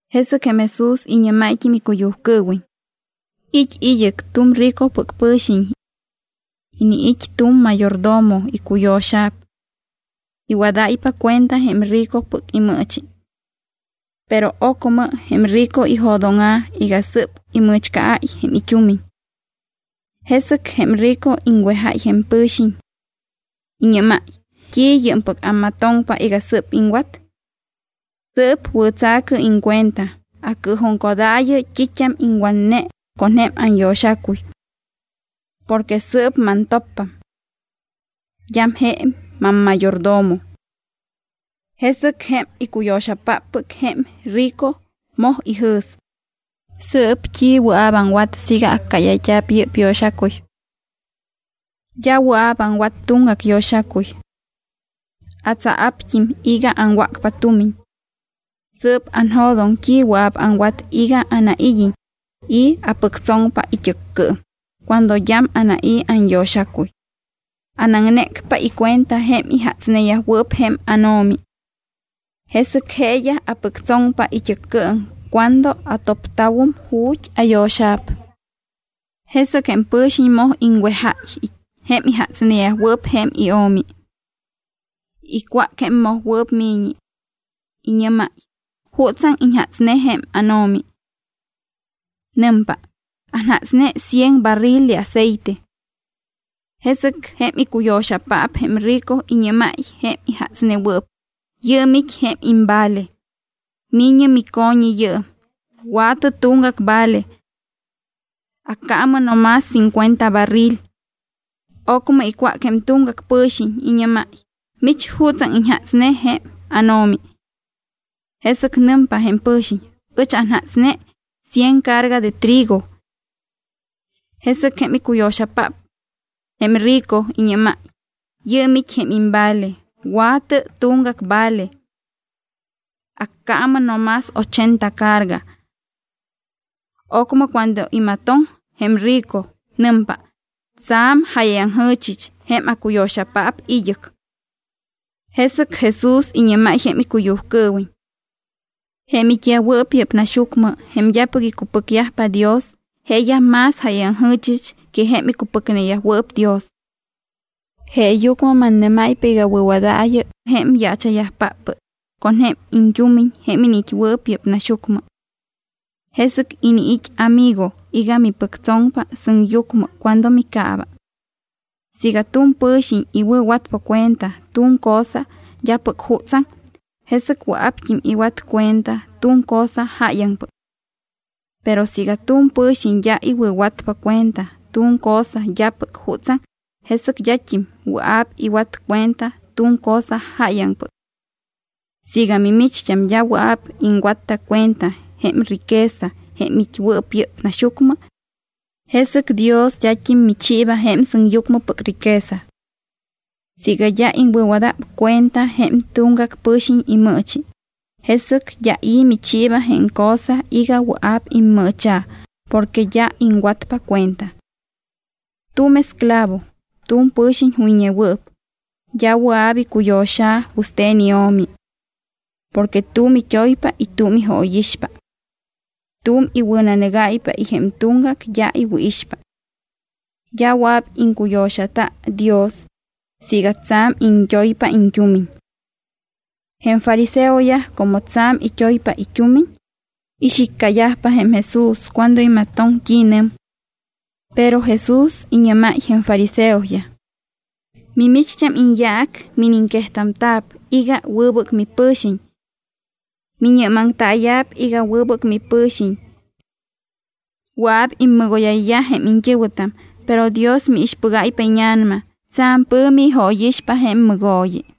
Jesɨc jém Jesús iñɨ́máyt́im icuyujcɨɨwiñ: —It́ id́ɨc tu̱m ricopɨc pɨ̱xiñ. Iniit́ tu̱m mayordomo icuyo̱xa̱p. Iwadáypa cuenta jém rico imɨɨchi. Pero ocmɨ jém rico ijo̱dóŋa̱ iga sɨ́p imɨ̱chcaáy jém it́umiñ. Jesɨc jém rico iŋwejáy jém pɨ̱xiñ. Iñɨ́máy: “¿T́i yɨɨmpɨc ammatoŋpa iga sɨ́p iŋwat? Sɨɨp wɨ̱tsa̱cɨ iŋcuenta, acɨɨjuŋcodaayɨ t́it́am iŋwatne con jém anyo̱xacuy. Porque sɨɨp mantoppam. D́am je mammayordomo.” Jesɨc jém icuyo̱xapáppɨc jém rico moj ijɨ̱s: “¿Sɨɨp, t́i wɨa̱p aŋwat siiga accáyayt́a̱p yɨ́p yo̱xacuy? D́a wɨa̱p aŋwat tuŋgac yo̱xacuy. Atsaa̱pt́im iga aŋwácpa tumiñ. Sɨɨp anjo̱doŋ t́i wɨa̱p aŋwat iga anaid́iñ i̱ apɨctsoŋpa it́ɨccɨɨm cuando d́am anai̱ anyo̱xacuy. Anaŋnécpa icuenta jém ijatsneyajwɨɨp jém áno̱mi. Jesɨc jeeyaj apɨctsoŋpa it́ɨccɨɨm cuando atopta̱wum ju̱t́ ayo̱xa̱p.” Jesɨc jém pɨ̱xiñ moj iŋwejayyaj jém ijatsneyajwɨɨp jém io̱mi. Icwác jém mojwɨɨp mi̱ñi. Iñɨ́máy: “¿Jutsaŋ iñjatsne jém áno̱mi?” Nɨmpa: “Anjatsne cien barril de aceite.” Jesɨc jém icuyo̱xapaap jém rico iñɨ́máy jém ijatsnewɨɨp: “Yɨɨm it́ jém imvale. Mi̱ñɨ mico̱ñi yɨɨm, wa̱tɨ tuŋgac vale. Accaamɨ no más cincuenta barril.” Ocmɨ icwác jém tuŋgac pɨ̱xiñ, iñɨ́máy: “¿Mich, jutsaŋ iñjatsne jém áno̱mi?” Jesɨc nɨmpa jém pɨ̱xiñ: “Ɨch anjatsne cien carga de trigo.” Jesɨc jém icuyo̱xapaap jém rico iñɨ́máy: “Yɨɨm it́ jém imvale, wa̱tɨ tuŋgac vale. Accaamɨ no más ochenta carga.” Ocmɨ cuando imatoŋ jém rico, nɨmpa: “Tsa̱m jáyayaŋjɨ̱chɨch jém acuyo̱xapaap id́ɨc.” Jesɨc Jesús iñɨ́máy jém icuyujcɨɨwiñ: —Jém it́yajwɨɨp yɨ́p naxyucmɨ, jém d́apɨc icupɨcyajpa Dios, jeeyaj más jáyayaŋjɨ̱chɨch que jém icupɨcneyajwɨɨp Dios. Jeeyucmɨ mannɨ́máypa iga wɨ̱wadaayɨ jém yaacha̱yajpáppɨc con jém iñt́umiñ jém iniit́wɨɨp yɨ́p naxyucmɨ. Jesɨc iniit́ amigo iga mipɨctsoŋpa sɨŋyucmɨ cuando micaaba. ’Siiga tu̱m pɨ̱xiñ iwɨ̱watpa cuenta tu̱m cosa d́apɨc jutsaŋ, jesɨc wɨa̱pt́im iwat cuenta tu̱m cosa jáyaŋpɨc. Pero siiga tu̱m pɨ̱xiñ d́a iwɨ̱watpa cuenta tu̱m cosa d́apɨc jutsaŋ, jesɨc d́at́im wɨa̱p iwat cuenta tu̱m cosa jáyaŋpɨc. Siiga mimicht́am d́a wɨa̱p iŋwatta cuenta jém riqueza jém it́wɨɨp yɨ́p naxyucmɨ, jesɨc Dios d́at́im michiiba jém sɨŋyucmɨpɨc riqueza. Siiga d́a iŋwɨ̱wada̱p cuenta jém tuŋgac pɨ̱xiñ imɨɨchi, jesɨc d́a i̱ michiiba jém cosa iga wɨa̱p immɨɨcha̱ porque d́a iŋwatpa cuenta. ’Tu̱m esclavo, tu̱m pɨ̱xiñ juyñewɨɨp, d́a wɨa̱p icuyo̱xa̱ wɨste̱n io̱mi. Porque tu̱m it́oypa y tu̱m ijóyixpa. Tu̱m iwɨ̱nanɨgáypa y jém tuŋgac d́a iwɨ̱ixpa. D́a wɨa̱p iŋcuyo̱xata Dios siiga tsa̱m iñt́oypa iñt́umiñ. Jém fariseoyaj como tsa̱m it́oypa it́umiñ, ixiccayajpa jém Jesús cuando imatoŋ t́i nɨm. Pero Jesús iñɨ́máy jém fariseoyaj: —Mimicht́am iñyaac miniŋquejta̱p iga wɨbɨc mipɨ̱xiñ. Miñɨ́maŋtaaya̱p iga wɨbɨc mipɨ̱xiñ. Wɨa̱p immɨgóyayyaj jém iñt́ɨ̱wɨtam, pero Dios miixpɨgáypa íña̱nama, tsa̱m pɨ̱mi ijóyixpa jém mɨgooyi.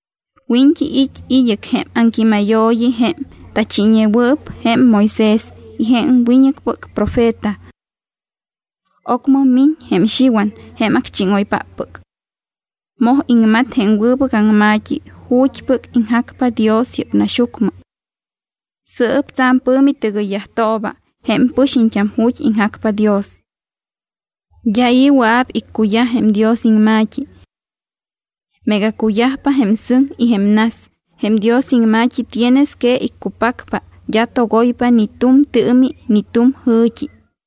’Wiñt́i it́ id́ɨc jém aŋquímayooyi jém tachiiñewɨɨp jém Moisés y jém wiñɨcpɨc profeta. Ocmɨ miñ jém Xiwan jém acchíŋoypáppɨc. Moj iŋmat jém wɨbɨc aŋma̱t́i ju̱t́pɨc iŋjacpa Dios yɨ́p naxyucmɨ. Sɨɨp tsa̱m pɨ̱mi tɨgɨyyajtooba jém pɨxiñt́am ju̱t́ iŋjacpa Dios. ’D́a i̱ wɨa̱p iccuyaj jém Dios iŋma̱t́i. Meega cuyajpa jém sɨŋ y jém nas, jém Dios iŋma̱t́i tienes que iccupacpa, d́a togoypa ni tu̱m tɨɨmi ni tu̱m jɨ̱t́i.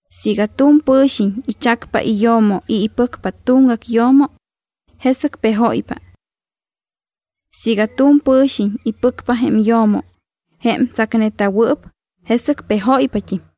’Siiga tu̱m pɨ̱xiñ ichacpa iyo̱mo y ipɨcpa tuŋgac yo̱mo, jesɨc pejóypa. Siiga tuŋgac pɨ̱xiñ ipɨcpa jém yo̱mo, jém tsacneta̱wɨɨp, jesɨc pejóypat́im.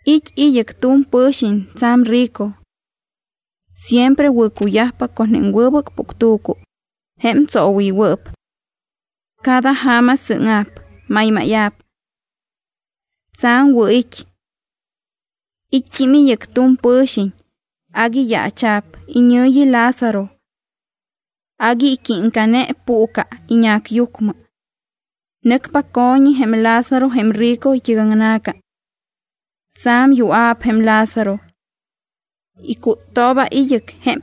’It́ id́ɨc tu̱m pɨ̱xiñ tsa̱m rico. Siempre wɨ̱cuyajpa con jém wɨbɨc puctu̱cu jém tsoowɨywɨɨp. Cada ja̱ma sɨ́ŋa̱p, maymáya̱p. Tsa̱m wɨ̱ it́. It́t́im id́ɨc tu̱m pɨ̱xiñ agui yaacha̱p, iñɨ̱yi Lázaro. Agui iquímcane puucɨ iñacyucmɨ. Nɨcpa co̱ñi jém Lázaro jém rico it́ɨc aŋna̱ca. Tsa̱m yua̱p jém Lázaro. Icúttooba id́ɨc jém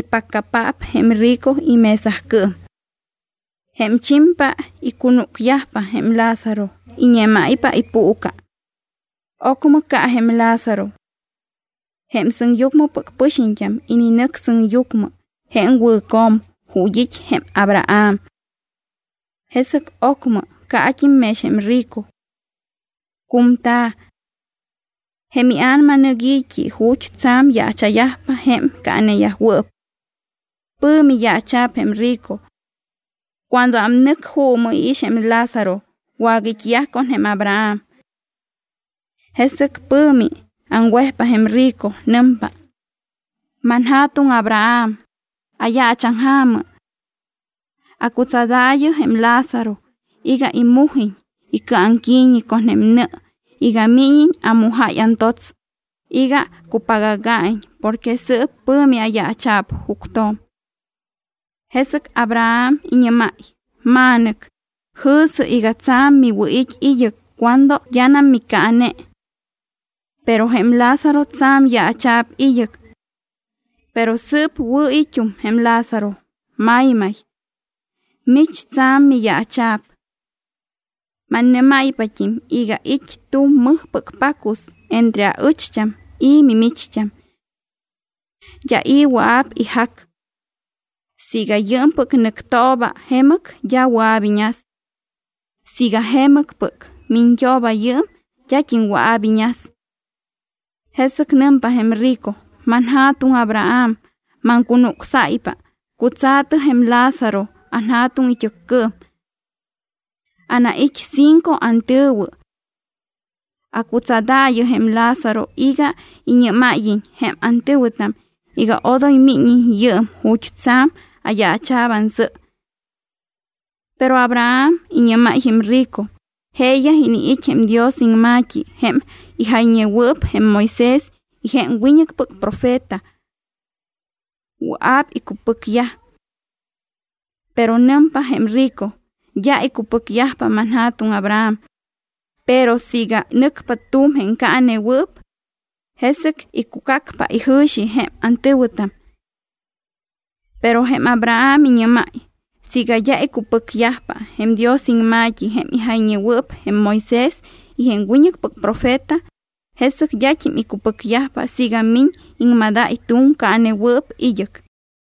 ipaccapaap jém rico imesacɨɨm. Jém chimpa icunúcyajpa jém Lázaro, iñémáypa ipuucɨ. Ocmɨ ca jém Lázaro. Jém sɨŋyucmɨpɨc pɨxiñt́am ininɨc sɨŋyucmɨ jém wɨ̱co̱m ju̱t́ it́ jém Abraham. Jesɨc ocmɨ caat́im mex jém rico. Cu̱mta̱. Jém ia̱nama nɨc i̱t́i ju̱t́ tsa̱m yaacha̱yajpa jém caaneyajwɨɨp. Pɨ̱mi yaacha̱p jém rico. Cuando ámnɨc, juumɨ iix jém Lázaro wagait́yaj con jém Abraham. Jesɨc pɨ̱mi aŋwejpa jém rico. Nɨmpa: “Manja̱tuŋ Abraham, ayaachaŋja̱mɨ. Acutsadaayɨ jém Lázaro iga imujiñ icɨaŋqui̱ñi con nɨ iga míñiñ amujáy antots iga cupagaga̱iñ porque sɨɨp pɨ̱mi ayaacha̱p juctjo̱m.” Jesɨc Abraham iñɨ́máy: “Ma̱nɨc, jɨ̱sɨ iga tsa̱m miwɨ̱it́ id́ɨc cuando d́anam micaane. Pero jém Lázaro tsa̱m yaacha̱p id́ɨc. Pero sɨɨp wɨ̱ it́um jém Lázaro, maymay. Mich tsa̱m miyaacha̱p. Mannɨ́máypat́im iga it́ tu̱m mɨjpɨc pacus entre aɨcht́am y mimicht́am. D́a i̱ wɨa̱p ijac. Siiga yɨɨmpɨc nɨctooba jemɨc, d́a wɨa̱p iñas. Siiga jemɨcpɨc miñt́ooba yɨɨm d́at́im wɨa̱p iñas.” Jesɨc nɨmpa jém rico: “Manja̱tuŋ Abraham, maŋcunucsáypa, cutsa̱tɨ jém Lázaro anja̱tuŋ it́ɨccɨɨm. Anait́ cinco antɨ̱wɨ. Accutsadaayɨ jém Lázaro iga iñɨ́máyiñ jém antɨ̱wɨtam iga odoy míñiñ yɨɨm ju̱t́ tsa̱m ayaacha̱p ansɨ.” Pero Abraham iñɨ́máy jém rico: “Jeeyaj iniit́ jém Dios iŋma̱t́i jém ijayñewɨɨp jém Moisés y jém wiñɨcpɨc profeta. Wɨa̱p icupɨcyaj.” Pero nɨmpa jém rico: “D́a icupɨcyajpa, manja̱tuŋ Abraham, pero siiga nɨcpa tu̱m jém caanewɨɨp, jesɨc icucacpa ijɨ̱xi jém antɨ̱wɨtam.” Pero jém Abraham iñɨ́máy: “Siiga d́a icupɨcyajpa jém Dios iŋma̱t́i jém ijayñewɨɨp jém Moisés y jém wiñɨcpɨc profeta, jesɨc d́at́im icupɨcyajpa siiga miñ iŋmadáy tu̱m caanewɨɨp id́ɨc.”